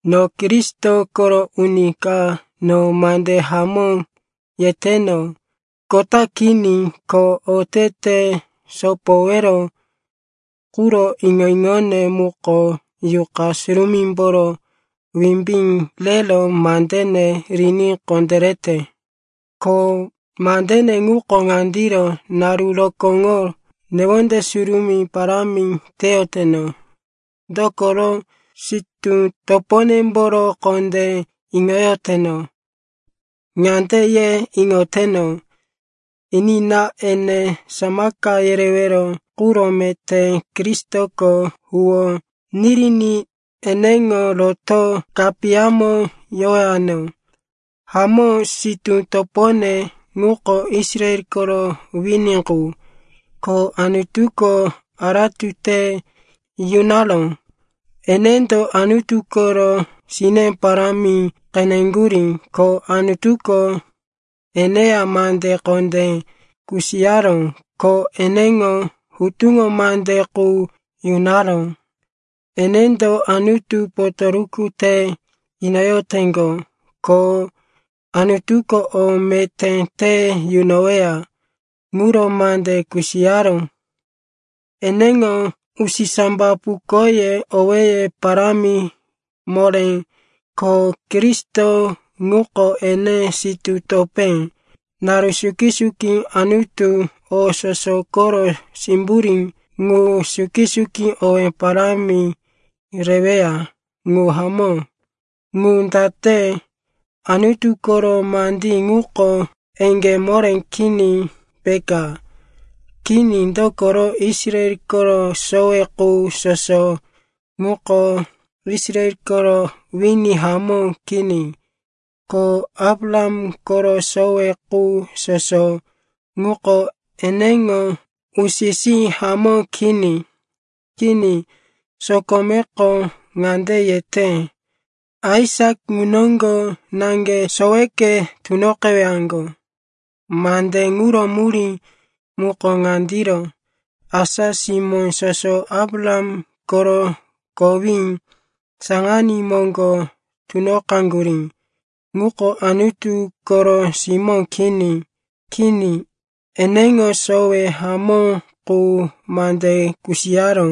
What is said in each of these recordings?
No Kristo koro uni ka, no mande hamó yeteno, kota kini. Ko otete sopowero quro iŋo-iŋone muko Yuqa Surumímboro wimbí rero mandene riní kondérete. Ko mandene ŋuko ŋandiro, naru rokóŋo newonde surumí parámi teyoteno, dokoro sitú toponemboro kondé iŋoyoteno. Ŋande ye iŋoteno, enina, ene samaka yerewero quro meté Kristoko huwó niriní eneŋo roto kapiyamo yowano. Hamó, sitú topone ŋuko Israel koro wini qu, ko Anutuko aratu te yunaró. Enendo Anutu koro sine parámi qeneŋgurí, ko Anutuko eneya mande kondé kusiyaró, ko eneŋo hutuŋo mande qu yunaró. Enendo Anutu potoruku te inoyoteŋgo, ko Anutuko o meté te yunoweya ŋuro mande kusiyaró. Eneŋo usisambapukoye owéye parámi moré, ko Kristo ŋuko ene sitú topé. Naru suki-suki Anutu, o soso koro simburí ŋu, suki-suki owí parámi reweya. Ŋu hamó. Ŋu date, Anutu koro mandí ŋuko eŋgé moré kini, peka? Kini, dokoro Israel koro sowe qu soso ŋuko Israel koro wini hamó kini. Ko Abraham koro sowe qu soso ŋuko eneŋo usi-sí hamó kini. Kini, sokomeko ŋande yete, “Aisak ŋu noŋgo naŋge soweke tunoqewaŋgo.” Mande ŋuro murí muko ŋandiro: asa simó soso Abraham koro kowí saŋaní moŋgo tunoqaŋgurí ŋuko Anutu koro simó kini. Kini, eneŋo sowe hamó qu mande kusiyaró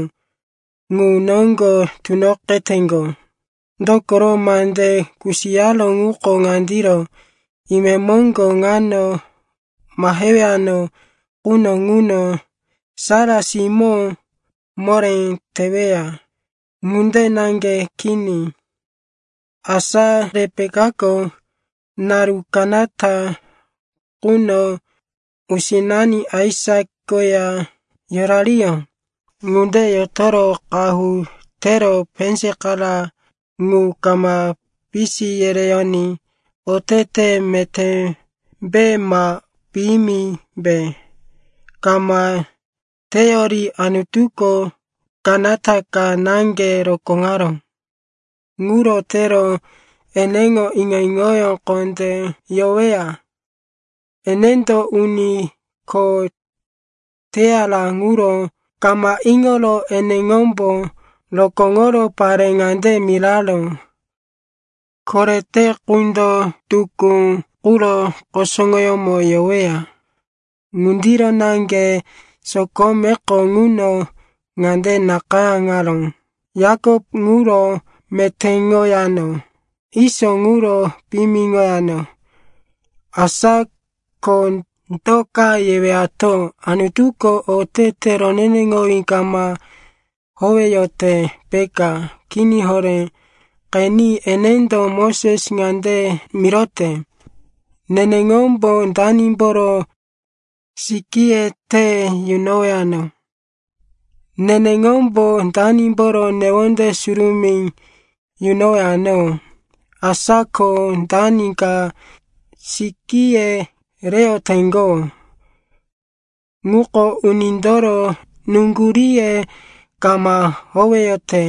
ŋu noŋgo tunoqeteŋgo. Dokoro mande kusiyaró ŋuko ŋandiro, “Imemoŋgo ŋano mahewano quno ŋuno Sara simó moré teweya.” Ŋunde naŋge kini. Asa Repekako naru kanata quno usinani Aisak koya yorariyó. Ŋunde yotoro qahu tero penzakara ŋu kama pisi yereyoní otete metémbe ma piyimimbe kama teyori Anutuko kanata ka naŋge rokóŋaró. Ŋuro tero eneŋo iŋo-iŋoyó kondé yoweya. Enendo uni kho teyara ŋuro kama iŋoro eneŋombo rokóŋoro pare ŋande miraró, “Korete qundo tukú quro kusuŋoyómo yoweya.” Ŋundiro naŋge sokomeko ŋuno ŋande nakayáŋaró, “Yakop ŋuro metéŋoyano, Iso ŋuro piyimiŋoyano.” Asa ko do ka yewato? Anutuko otete roneneŋowí kama howeyote, peka? Kini horé! Qeni, enendo Moses ŋande mirote, “Neneŋombo danimboro sikíye te yunowano, neneŋombo danimboro newonde surumí yunowano.” Asa ko dani ka sikíye reyoteŋgo ŋuko unindoro nuŋguríye kama howeyote,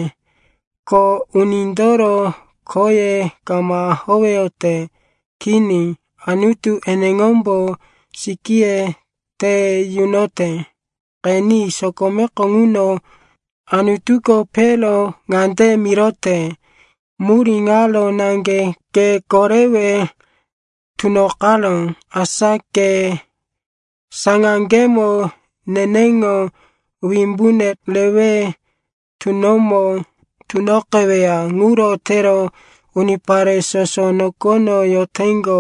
ko unindoro khoye kama howeyote. Kini, Anutu eneŋombo sikíye te yunote. Qeni, sokomeko ŋuno Anutuko Pero ŋande mirote, “Murí ŋaro naŋge ke korewe tunoqaró, asa ke saŋaŋgemo neneŋo wimbune rewe tunomo tunoqeweya. Ŋuro tero unipare soso nokono yoteŋgo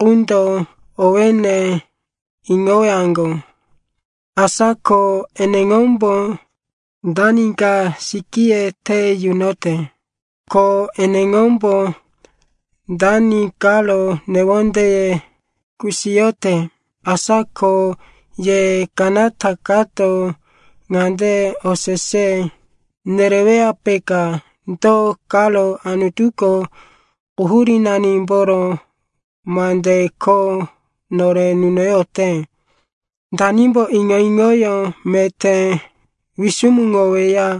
qundo owéne iŋowaŋgo.” Asa ko eneŋombo dani ka sikíye te yunote, ko eneŋombo dani karo newondeye kusiyote. Asa ko ye kanata kato ŋande osese nereweya, peka, “Do karo Anutuko quhurínanimboro mande kho nore nunoyote? Danimbo iŋo-iŋoyó meté wisumuŋoweya?”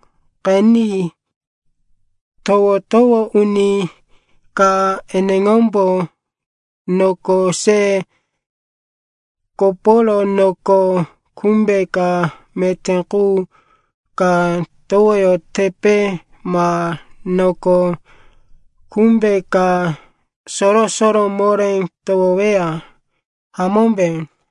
Qeni, towo-towo uni ka eneŋombo noko se koporo noko kumbe ka meté qu ka towoyotepe, ma noko kumbe ka soro-soro moré towoweya, hamómbe?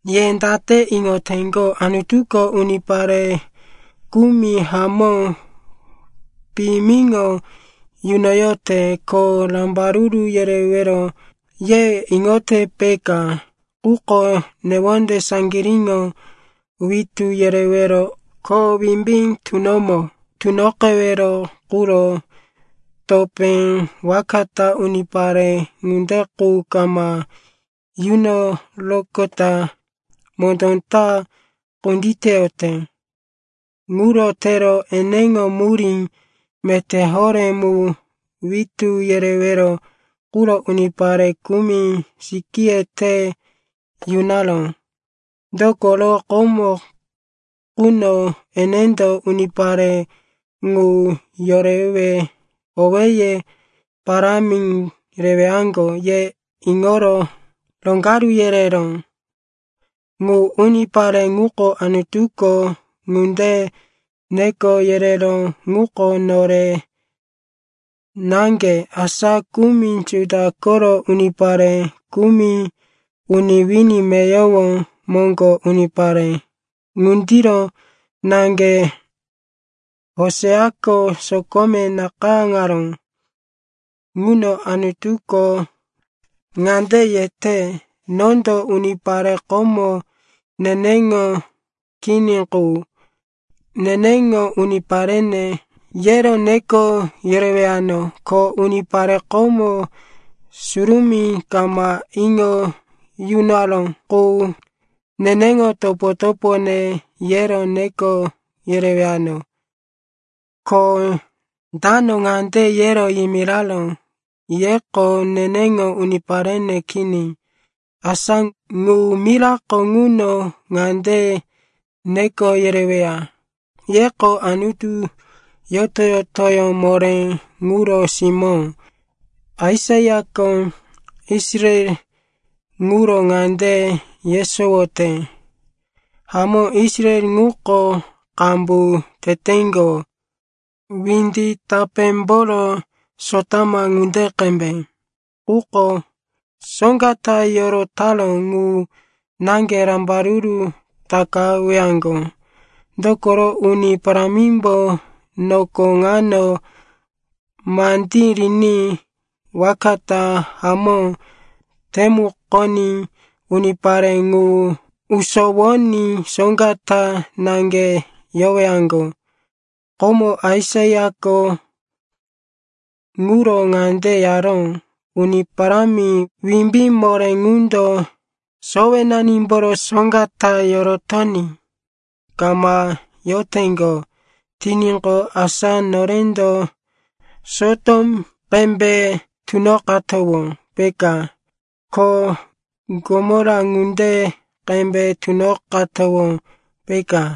Ye date iŋoteŋgo? Anutuko unipare kumi hamó piyimiŋo yunoyote, ko rambaruru yerewero, ye iŋote, peka. Quko newonde saŋgiríŋo witú yerewero ko wimbí tunomo tunoqewero quro topé waka ta unipare ŋunde qu kama yunoroqota mondó ta kunditeyote. Ŋuro tero eneŋo murí meté horé mu witú yerewero quro unipare kumi sikíye te yunaró. Dokoro komo quno enendo unipare ŋu yorewe owéye parámi rewaŋgo ye iŋoro roŋgaru yereró. Ŋu unipare ŋuko Anutuko ŋunde neko yereró ŋuko nore naŋge, asa kumi Juda koro unipare, kumi uni wini meyowo moŋgo unipare. Ŋundiro naŋge Hoseako sokome nakayáŋaró ŋuno Anutuko ŋande yete, “Nondo unipare komo neneŋo kini qu, ‘Neneŋo uniparene,’ yero neko yerewano, ko unipare komo surumí kama iŋo yunaró qu, ‘Neneŋo topo-topone,’ yero neko yerewano. Ko “dano ŋande yero yimiraró, ‘Yeko neneŋo uniparene kini,’ asa ŋu mirako ŋuno ŋande neko yereweya, ‘Yeko Anutu yoto-yotoyó moré ŋuro simó.’” Aisaiako Israel ŋuro ŋande yesowote, “Hamó, Israel ŋuko qambu teteŋgo, windi tapémboro sotama ŋunde qembe quko soŋga ta yorotaró ŋu naŋge rambaruru takawaŋgo. Dokoro Uni Parámimbo noko ŋano mandí riní waka ta hamó temukoní unipare ŋu usowoní soŋga ta naŋge yowaŋgo.” Komo Aisaiako ŋuro ŋande yaró, “Uni Parámi Wimbí Moré ŋundo sowenanimboro soŋga ta yorotoní kama yoteŋgo tiníqo asa norendo Sotom qembe tunoqatowó, peka, ko Gomora ŋunde qembe tunoqatowó, peka.”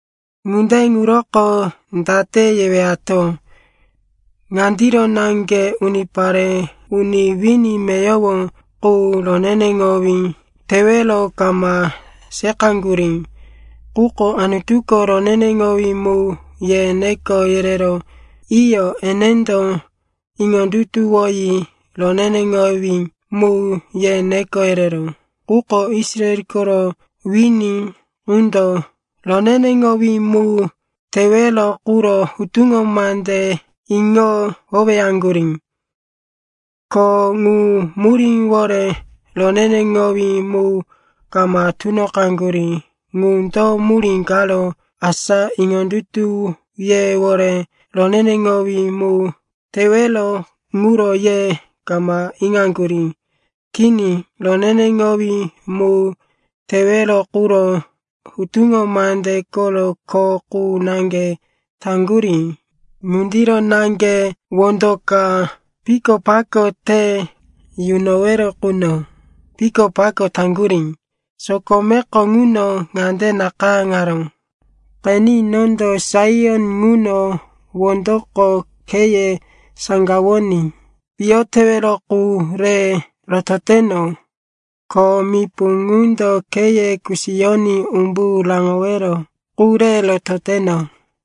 Ŋunde ŋuroko date yewato? Ŋandiro naŋge, unipare uni wini meyowo qu roneneŋowí tewero kama seqaŋgurí, quko Anutuko, roneneŋowí mu, ye neko yereró. Iyo, enendo iŋondutuwoyi, roneneŋowí mu, ye neko yereró. Quko Israel koro wini ŋundo roneneŋowí mu tewero quro hutuŋo mande iŋo howeyaŋgurí. Ko ŋu muríwore roneneŋowí mu kama tunoqaŋgurí. Ŋu do murí karo? Asa iŋondutuyewore roneneŋowí mu tewero ŋuro ye kama iŋaŋgurí. Kini, roneneŋowí mu tewero quro hutuŋo mande koro kho qu naŋge taŋgurí. Ŋundiro naŋge wondo ka pikopako te yunowero quno pikopako taŋgurí. Sokomeko ŋuno ŋande nakayáŋaró, “Qeni, nondo Saion ŋuno wondoko kheye saŋgawoní piyo tewero qu re rototeno, ko mipu ŋundo kheye kusiyoní umbu raŋowero qu re rototeno.